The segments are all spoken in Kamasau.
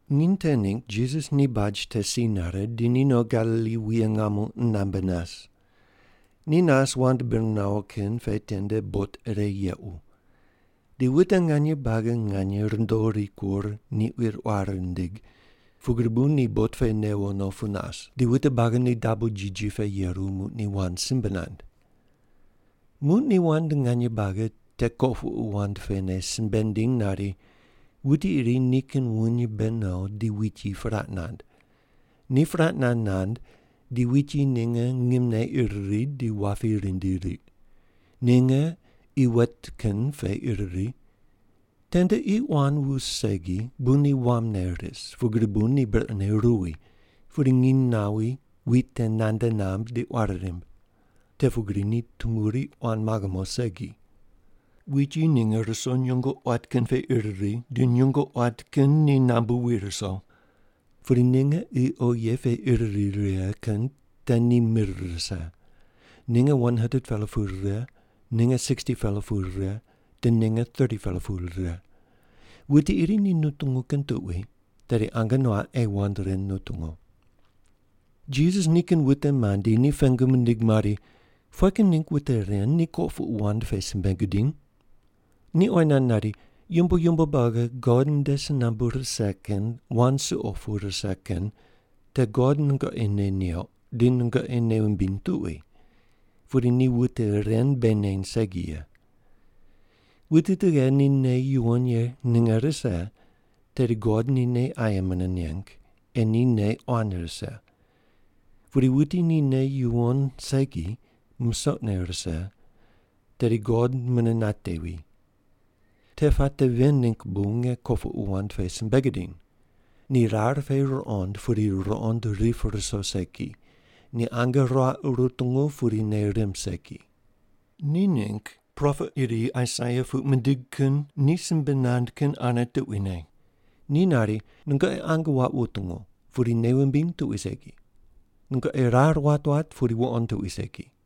Nginy te ningg Jisas ni baj te si nare, di ni no Galili wuye ngamo qunambe nas. Ni nas wand bir nawo kin pe tende bot ire yequ. Di wute nganye buagi nganye rundo rikur ni quir quar rindig, pugri bu ni bot pe newo no nas, di wute buagi ni dabo jiji pe yeru, muq ni wand simbe nand. Muq ni wand nganye buagi te kopuqu wand pene simbe nindiny nari, “Wuti iri nikin wuny mbe no di wit yi puraq nand. Ni puraq nand nand di wit yi ninge ngimne ir ri, di wapi rindi riq. Ninge qi wet kin pe ir ri. Tende qi quan wus segi bu ni wamne ris, pugri bu ni brequne ruwi, pudi nginy nawi, wit te nande namb di quari rimb. Te pugri ni tumuri quan maghe mo segi. Wit yi ninge ruso nyungo quat kin pe ir ri di nyungo quat kin ni nambu wi ruso. Pudi ninge qi oghi ye pe ir ri righe kin te ni mir rise. Ninge 100-pela pu rire, ninge 60-pela pu rire, di ninge 30-pela pu rire. Wuti iri ni nutungu kin tuqui tedi ange nuaq ei wand ren nutungu.” Jisas nikin wute mandi ni pengu mindig mari, “Pughe kin ningg wute ren nu kopuqu wand pe simbe gudiny?” Ni oyi nand nari, “Yumbo yumbo buagi God nde si nambu rise kin wand suqo pu rise kin te God nungoqi nei neuq di nungoqi nei wumbiny tuqui, pudi ni wute ren bei neny segi ye. Wuti tughe ni nei yuwon ye ninge rise, tedi God ni nei aye mune neng, ei ni nei quan rise. Pudi wuti ni nei yuwon segi, musoqne rise, tedi God mune natevi. Te puate ven ningg bu nge kopuqu wand pe simbe gidiny. ‘Ni rar pe ruqond pudi ruqond rip ruso segi. Ni ange ruaq rutungu pudi nei rimb segi.’ Ni ningg propet iri Aisaia puq mindig kin ni simbe nand kin ane tuquine. Ni nari, ‘Nungoqi ange waq wutungu, pudi nei wumbiny tuqui segi. Nungoqi rar wat wat, pudi wuqond tuqui segi.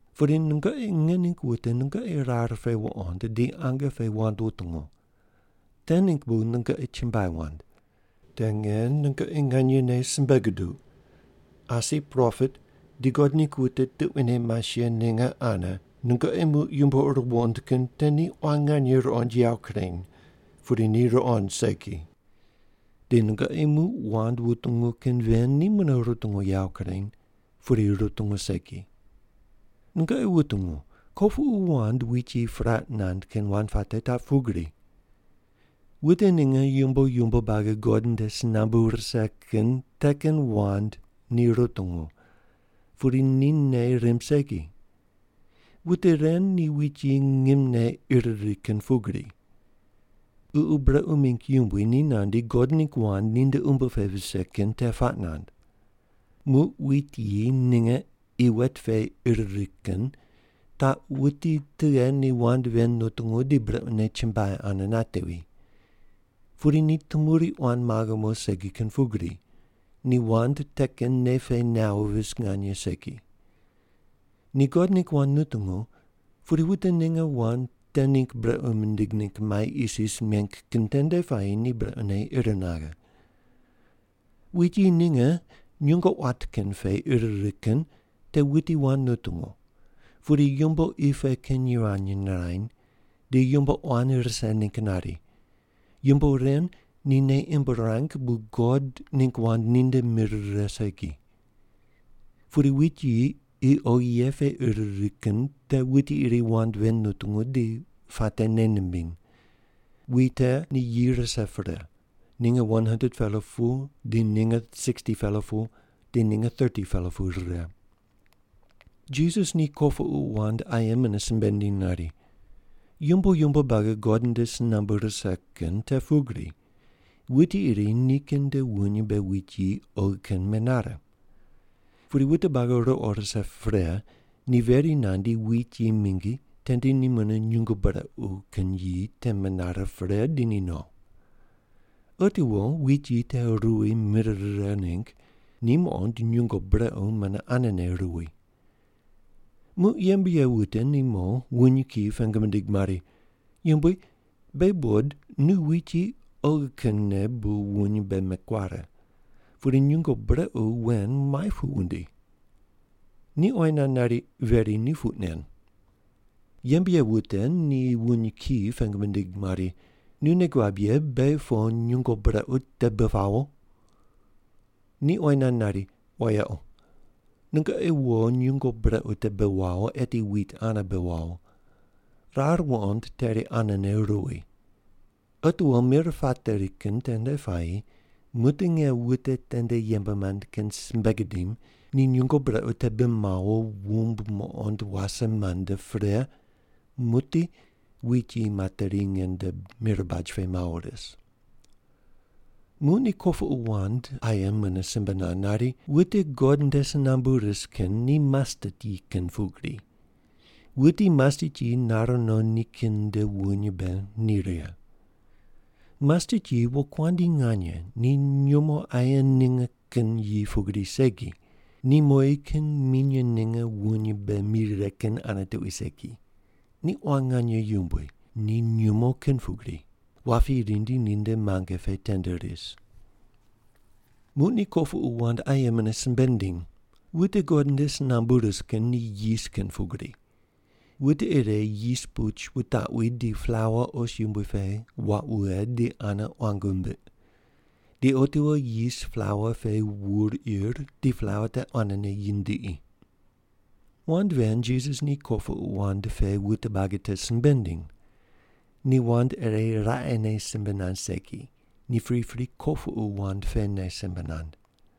Pudi nungoqi nge ningg wute nungoqi rar pe wuqond, di ange pe wand wutungu. Te ningg bu nungoqi chumbuai wand. Te nge nungoqi nganyene simbe guduq, asi propet di God ningg wute tuquine mas ye ninge ane nungoqi muq yumbo ur wuqond kin te ni quan nganye ruqond yawo kureny, pudi ni ruqond segi. Di nungoqi muq wand wutungu kin ven ni mune rutungu yawo kureny, pudi rutungu segi. “Nungoqi wutungu, kopuqu wand wit yi puraq nand kin wand puate taq pugri: Wute ninge yumbo yumbo buagi God nde si nambu rise kin te kin wand ni rutungu, pudi ni nei rimb segi. Wute ren ni wit yi ngimne ir ri kin pugri. Ququ brequ mingg yumbui ni nandi God ningg wand ninde umbo pe vise kin te puaq nand. Muq wit yi ninge qi wet pe ir ri kin taq wuti tughe ni wand ven nutungu di brequne chumbuai ane natevi. Pudi ni tumuri quan maghe mo segi kin pugri, ni wand te kin nei pe nawo vis nganye segi. Ni God ningg wand nutungu, pudi wute ninge wand te ningg brequ mindig ningg mai isis meng kin tende puayi ni brequne ir naghe. Wit yi ninge nyungo quat kin pe ir righe kin te wuti wand nutungu, pudi yumbo qi pe kin yivany nirany, di yumbo quan rise ningg nari. Yumbo ren ni nei imb ruang bu God ningg wand ni nde mir rire segi. Pudi wit yi qi oghi ye pe ir ri kin te wuti iri wand ven nutungu di puate nei nimbiny. Wit te ni yi rise pre, ninge 100-pela pu di ninge 60-pela pu di ninge 30-pela pu rire.” Jisas ni kopuqu wand aye mune simbe nindiny nari, “Yumbo yumbo buagi God nde si nambu rise kin te pugri, wuti iri nikin nde wuny mbe wit yi oghi kin menare. Pudi wute buagi ruqo rise pre, ni veri nandi wit yi mingi tende ni mune nyungo brequ kin yi te menare pre, di ni no. Otiwo wit yi te ruwi mir rire ningg, ni muqond nyungo brequ mune anene ruwi. “Muq yembe ye wute ni mo wuny kiyi pengu mindig mari, ‘Yumbui, beghi buqod nu wit yi oghi kinne bu wuny mbe mekuare. Pudi nyungo brequ wen muai pu wundi?’ “Ni oyi nand nari, ‘Veri ni puq nen!’ “Yembe ye wute ni wuny kiyi pengu mindig mari, ‘Nu nei guab ye beghi po nyungo brequ te bi pawo?’ “Ni oyi nand nari, ‘Wayequ. Nungoqi wo nyungo brequ te bi wawo, eti wit ane bi wawo. Rar wuqond teri anene ruwi. Otiwo mir pateri kin tende puayi, muqdi nge wute tende yembe mand kin simbe gidim, ni nyungo brequ te bi mawo wumb muqond wase mande pre, muqdi wit yi materi nge nde mir baj pe mawo ris’.” Muq ni kopuqu wand aye mune simbe nand nari, “Wute God nde si nambu ris kin ni mastet yi kin pugri. Wuti mastet yi nare no nikin nde wuny mbe ni righe. Mastet yi wokuandi nganye ni nyumo aye ninge kin yi pugri segi, ni mowi kin minye ninge wuny mbe mi righe kin ane tuqui segi, ni quan nganye yumbui, ni nyumo kin pugri. Wapi rindi ninde muange pe tende ris.” Muq ni kopuqu wand aye mune simbe nindiny, “Wute God nde si nambu ris kin ni yis kin pugri. Wute ire yis puch wutaqwi di plaua os yumbui pe waq wughe di ane quang wumbiq. Di otiwo yis plaua pe wur ir di plaua te quanene yindiqi.” Wand ven Jisas ni kopuqu wand pe wute buagi te simbe nindiny. Ni wand ire raqene simbe nand segi, ni pripri kopuqu wand pene simbe nand.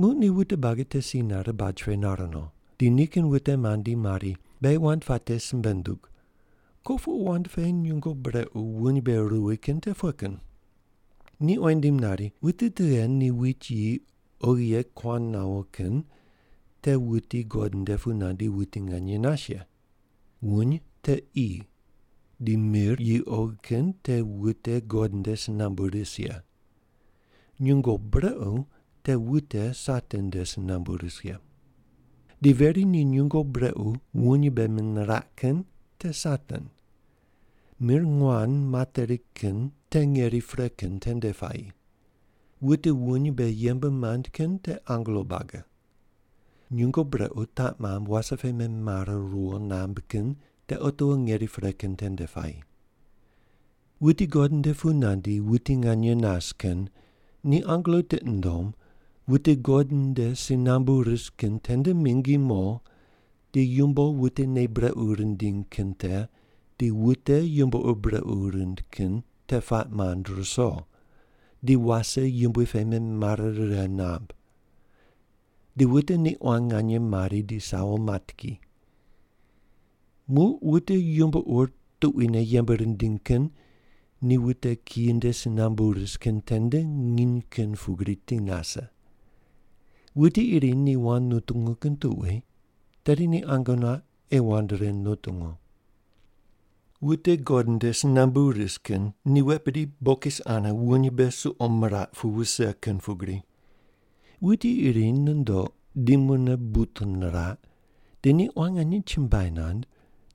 Muq ni wute buagi te si nare baj pe nar no. Di nikin wute mandi mari, “Beghi wand puate simbe ndug, kopuqu wand pe nyungo brequ wuny mbe ruwi kin te pughe kin?” Ni oyi nindim nari, “Wuti tughe ni wit yi oghi ye kuan nawo kin te wuti God nde pu nandi wuti nganye nas ye. Wuny te qi. Di mir yi oghi kin te wute God nde si nambu ris ye. Nyungo brequ te wute Satan nde si nambu ris ye. Di veri ni nyungo brequ wuny mbe meniraq kin te Satan. Mir nguan materi kin te ngeri pre kin tende puayi. Wute wuny mbe yembe mand kin te angelo buagi. Nyungo brequ taq mamb wase pe memare riwo namb kin te otiwo ngeri pre kin tende puayi. Wuti God nde pu nandi wuti nganye nas kin ni angelo tiqi nundom wute God nde si nambu ris kin tende mingi mo di yumbo wute nei brequ rindiny kin te di wute yumbo ur brequ rind kin te puaq mand ruso, di wase yumbui pe memare righe namb. Di wute ni quan nganye mari di sawo mat ki. Muq wute yumbo ur tuquine yembe rindiny kin ni wute kiyi nde si nambu ris kin tende nginy kin pugri ti nase. Wuti iri ni wand nutungu kin tuqui tedi ni ange nuaq ei wand ren nutungu.” “Wute God nde si nambu ris kin ni wet bidi bokis ane wuny mbe suqo miraq pu wuse kin pugri. Wuti iri nundoq di mune but niraq, di ni quan nganye chumbuai nand,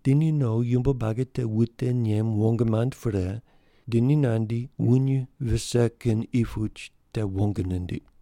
di ni no yumbo buagi te wute nem wong mand pre, di ni nandi wuny vise kin qi puch te wong nindiq.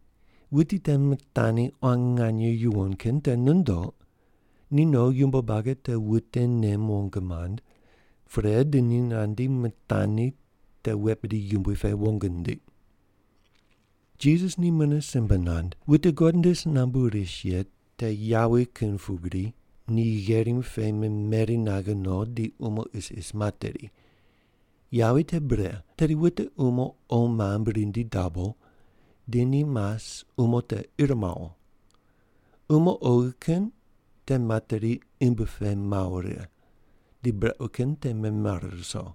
Wuti te mitani quan nganye yuwon kin te nundoq, ni no yumbo buagi te wute nem wong mand, pre di ni nandi mitani te wet bidi yumbui pe wong nindiq.” Jisas ni mune simbe nand, “Wute God nde si nambu ris ye te yawi kin pugri ni gherim pe memeri naghe no di umo isis materi. Yawi te bre, tedi wute umo qo mamb rindi dabo, di ni mas umo te ir mawo. Umo oghi kin te materi imbi pe mawo righe, di brequ kin te memare ruso.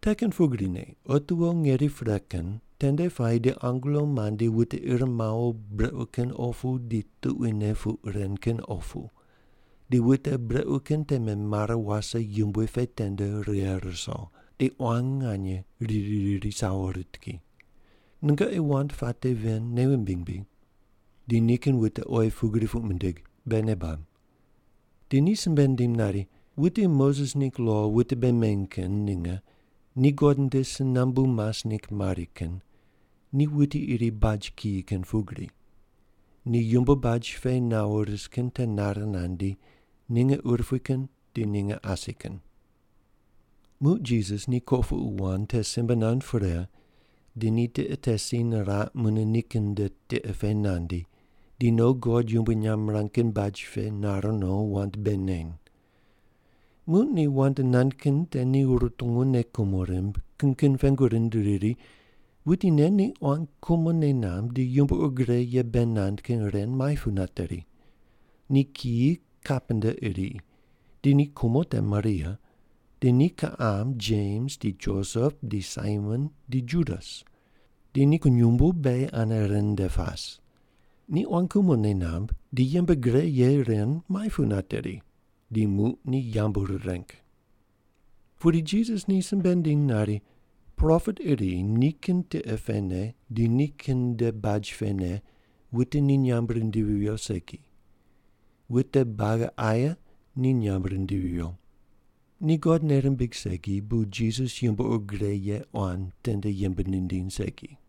Te kin pugrine otiwo ngeri pre kin tende puayi di angelo mandi wute ir mawo brequ kin opu di tuquine puq ren kin opu, di wute brequ kin te memare wase yumbui pe tende righe ruso, di quan nganye riri riri sawo rit ki. Nungoqi wand puate ven nei wumbiny bri?” Di nikin wute oyi pugri puq mindig, “Beghi nei bab.” Di ni simbe nindim nari, “Wute Moses ningg lo wute bei meny kin ninge ni God nde si nambu mas ningg mari kin, ni wuti iri baj kiyi kin pugri. Ni yumbo baj pe nawo ris kin te nare nandi, ninge urupui kin di ninge asi kin.” Muq Jisas ni kopuqu wand te simbe nand pre, di ni tiqe te si niraq, mune nikin nde tiqe pe nandi, di no God yumbui nyamb mirang kin baj pe nar no, wand bei neny. Muq ni wand nand kin te ni rutungu nei kumo rimb, kin kin pengu rind riri, “Wuti nen ni quan kumo nei namb di yumbo ur gre ye bei nand kin ren muai pu nateri? Ni kiyi kapenta iri. Di ni kumo te Maria. Di ni kiqam Jems di Josep di Saimon di Judas. Di ni kunyumbu beghi ane ren nde pas. Ni quan kumo nei namb di yembe gre ye ren muai pu nateri?” Di muq ni yambu rireng. Pudi Jisas ni simbe nindiny nari, “Propet iri nikin tiqe pene di nikin nde baj pene wute ni nyamb rindivi viyo segi. Wute buagi aye ni nyamb rindivi viyo.” Ni God nei rimbig segi, bu Jisas yumbo ur gre ye quan tende yembe nindiny segi.